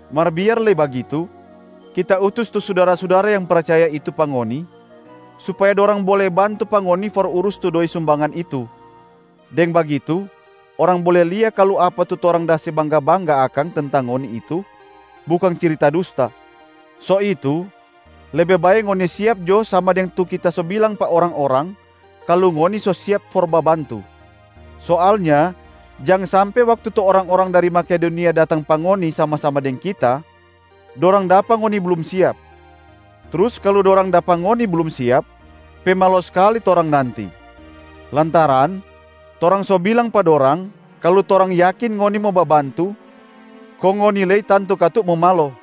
Mar biar lei bagitu, kita utus tu sudara-sudara yang percaya itu pa ngoni supaya dorang bole bantu pa ngoni for urus tu doi sumbangan itu, deng bagitu orang bole lia kalu apa tu torang da se bangga-bangga akang tentang ngoni itu bukang cirita dusta. So itu, lebe bae ngoni siap jo sama deng tu kita so bilang pa orang-orang kalu ngoni so siap for babantu. Soalnya jang sampe waktu tu orang-orang dari Makedonia datang pa ngoni sama-sama deng kita, dorang dapa ngoni blum siap. Trus kalu dorang dapa ngoni blum siap, pe malo skali torang nanti, lantaran torang so bilang pa dorang kalu torang yakin ngoni mo babantu, kong ngoni lei tantu katu mo malo.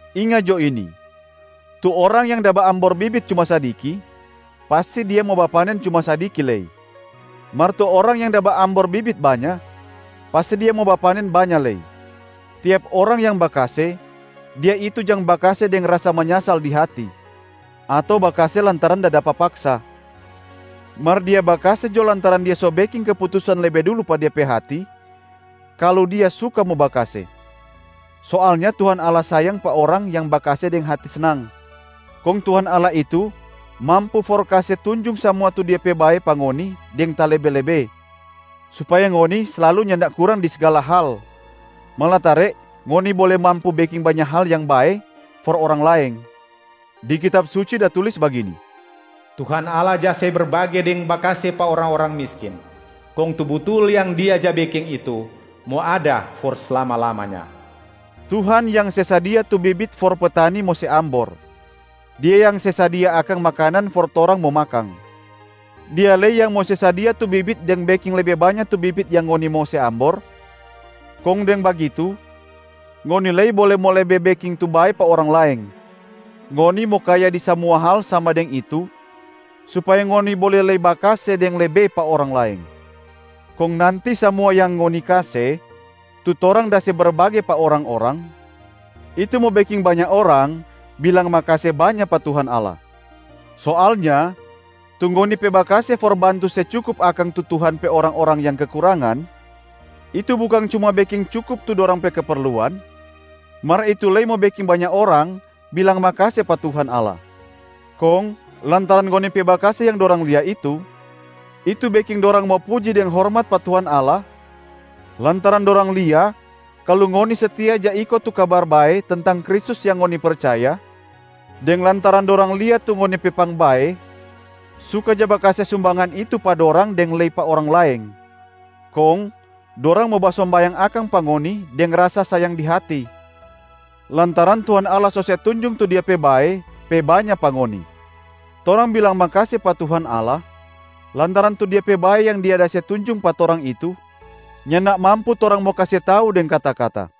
Inga jo ini: tu orang yang da baambor bibit cuma sadiki, pasti dia mo bapanen cuma sadiki lei. Mar tu orang yang da baambor bibit banya, pasti dia mo bapanen banya lei. Tiap orang yang bakase, dia itu jang bakase deng rasa manyasal di hati ato bakase lantaran da dapa paksa, mar dia bakase jo lantaran dia so beking keputusan lebe dulu pa de pe hati kalu dia suka mo bakase. Soalnya Tuhan Allah sayang pa orang yang bakase deng hati snang. Kong Tuhan Allah itu mampu for kase tunjung samua tu Dia pe bae pa ngoni deng talebe-lebe, supaya ngoni slalu nyanda kurang di sgala hal malatare ngoni bole mampu beking banya hal yang bae for orang laeng. Di Kitab Suci da tulis bagini, “Tuhan Allah ja se berbage deng bakase pa orang-orang miskin, kong tu butul yang Dia ja beking itu mo ada for slama-lamanya.” Tuhan yang se sadia tu bibit for petani mo se ambor, Dia yang se sadia akang makanan for torang mo makang. Dia lei yang mo se sadia tu bibit deng beking lebe banya tu bibit yang ngoni mo se ambor, kong deng bagitu ngoni lei bole mo lebe beking tu bae pa orang laeng. Ngoni mo kaya di samua hal sama deng itu supaya ngoni bole lei bakase deng lebe pa orang laeng. Kong nanti samua yang ngoni kase tu torang da se berbage pa orang-orang, itu mo beking banya orang bilang makase banya pa Tuhan Allah. Soalnya tu ngoni pe bakase for bantu se cukup akang tu Tuhan pe orang-orang yang kekurangan, itu bukang cuma beking cukup tu dorang pe keperluan, mar itu lei mo beking banya orang bilang makase pa Tuhan Allah. Kong lantaran ngoni pe bakase yang dorang lia itu, itu beking dorang mo puji deng hormat pa Tuhan Allah lantaran dorang lia kalu ngoni setia ja iko tu Kabar Bae tentang Kristus yang ngoni percaya, deng lantaran dorang lia tu ngoni pe pangbae suka ja bakase sumbangan itu pa dorang deng lei pa orang laeng. Kong dorang mo basombayang akang pa ngoni deng rasa sayang di hati, lantaran Tuhan Allah so se tunjung tu Dia pe bae pe banya pa ngoni. Torang bilang makase pa Tuhan Allah lantaran tu Dia pe bae yang Dia da se tunjung pa torang itu nyanda mampu torang mo kase tau deng kata-kata.